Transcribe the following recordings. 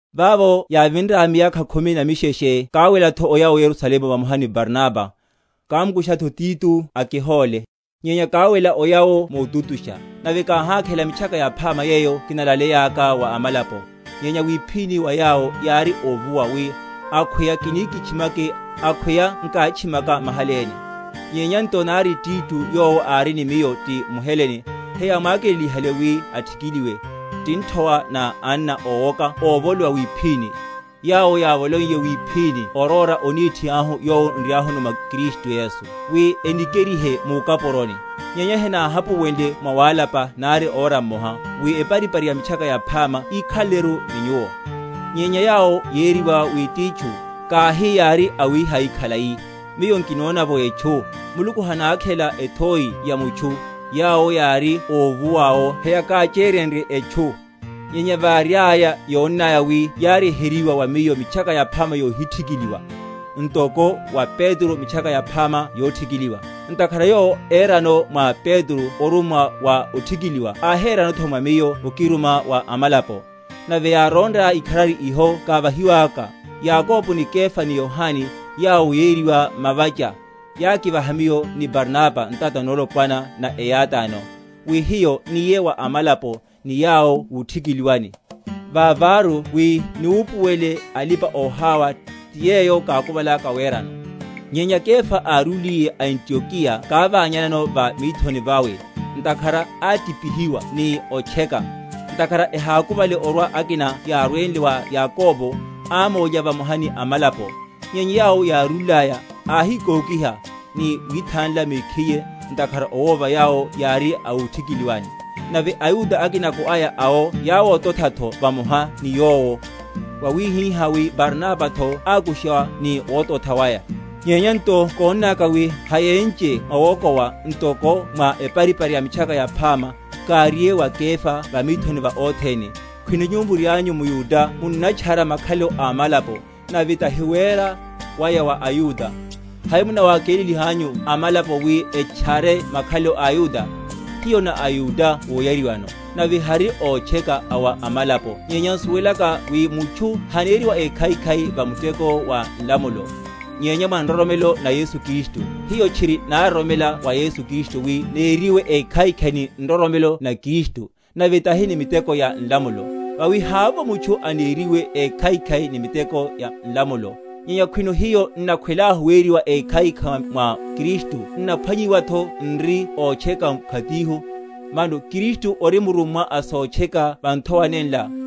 Vavo yávinraya miyakha khumi na misheshe káwelatho oya o Yerusalemu vamoha ni Barnaba, kámukushatho Tito akihóle. Nyenya káwela oya’wo motutusha; nave káháléla Mitchaka Yaphama yeyo kinalaleyaka wa amalapo; nyenya wiphíni wa yawo yári óvuwa, wi akhweya kini kitchimake, akhweya nkátchimaka mahaléne. Nyenya nto nari Tito, yowo ári ni miyo, ti mHelene, heyámwakelelihale wi athikiliwe; ti nthowa na anna ówoka ovolíhiwa wiphíni, yawo yávoloiye wiphíni oróra onethi ahu yowo nriahuno mwa Kristu Yesu, wi enikerihe mukapuroni. Nyenya henáhapuwenle mwawálapa nari ora mmoha; wi eparipari ya Mitchaka Yaphama yikhaleleru ni nyuwo. Nyenya yawo yériwa wi titchu (kahi yári awihai khalai, miyo nkinona’vo etchu; Muluku hanákhela ethoi ya mutchu) yawo yári óvuwa’wo heyákacheryenrye etchu; nyenya variaya, yónnaya wi yánnyeryeryiwa wa miyo Mitchaka Yaphama yohithikiliwa, ntoko wa Petro Mitchaka Yaphama yothikiliwa; (ntakhara Yowo érano mwa Petro omuruma wa óthikiliwa áhéranotho mwa miyo okiruma wa amalapo); nave yárónraya ikharari iho kávahiwaka, Yakobo ni Kefa ni Yohane, yawo yériwa mavacha, yákivaha miyo ni Barnaba ntata nolopwana na eyátáno, wi hiyo niye wa amalapo, ni yawo wuthikiliwani; vaváru wi niwupuwele alipa‐oháwa, ti yeyo kákuvalaka werano. Nyenya Kefa árúliye a Antiokeya kávanyanano va mithoni vawe, ntakhara átipihiwa ni otcheka. Ntakhara ehákuvale orwa akina yárwenle wa Yakobo, ámólya vamoha ni amalapo; nyenya yawo yárúlaya, áhikókiha, ni withanla mekhiye, ntakhara owova yawo yári a wuthikiliwani. Nave aYuda akinako aya awo yáwotothatho vamoha ni yowo; wawihihá wi Barnabatho ákushiwa ni wototha waya. Nyenya nto kónnaka wi hayénche mwawokowa, ntoko mwa eparipari ya Mitchaka Yaphama, káriye wa Kefa va mithoni va othene. Khwino nyuwo murianyu mYuda munnatchara makhalelo a amalapo, nave tahi wera waya wa aYuda, hai munawakelelihanyu amalapo wi etchere makhalelo a aYuda? Hiyo na aYuda moyariwano, nave hanri ótcheka a wa amalapo; nyenya n’suwelaka wi mutchu haneriwa ékhaikhai va muteko wa nlamulo, nyenya mwa nroromelo na Yesu Kristu, hiyo tchiri nároromela wa Yesu Kristu, wi neriwe ékhaikhai ni nroromelo na Kristu, nave tahi ni miteko ya nlamulo; vawi havovo mutchu anarwe‐eriwe ékhaikhai ni miteko ya nlamulo. Nyenya khwino hiyo, n’nakhwelahu weriwa ékhaikhai mwa Kristu, n’naphwanyiwatho n’ri ótcheka mkhatihu, mano Kristu ori murummwa a sotcheka va nthowa nenla?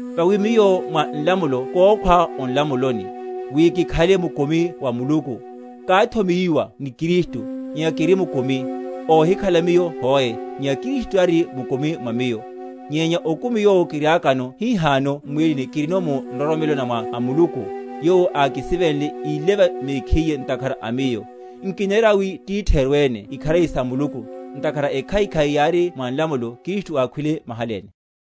Vawi miyo mwa nlamulo kókhwa o nlamuloni, wi kikhale mukumi wa Muluku. Káthomeyiwa ni Kristu; nyenya kiri mukumi; óhikhala miyo hoe, nyenya Kristu tari mukumi mwa miyo; nyenya okumi yowo kiriakano hihano m’mwílini kirino mu nroromelo na Mwana a Muluku, yowo ákisivenle, íleva mekhiye ntakhara a miyo. Nkinera wi titheru ene ikharari sa Muluku; ntakhara ekhaikhai yári mwa nlamulo, Kristu ákhwile mahaléne.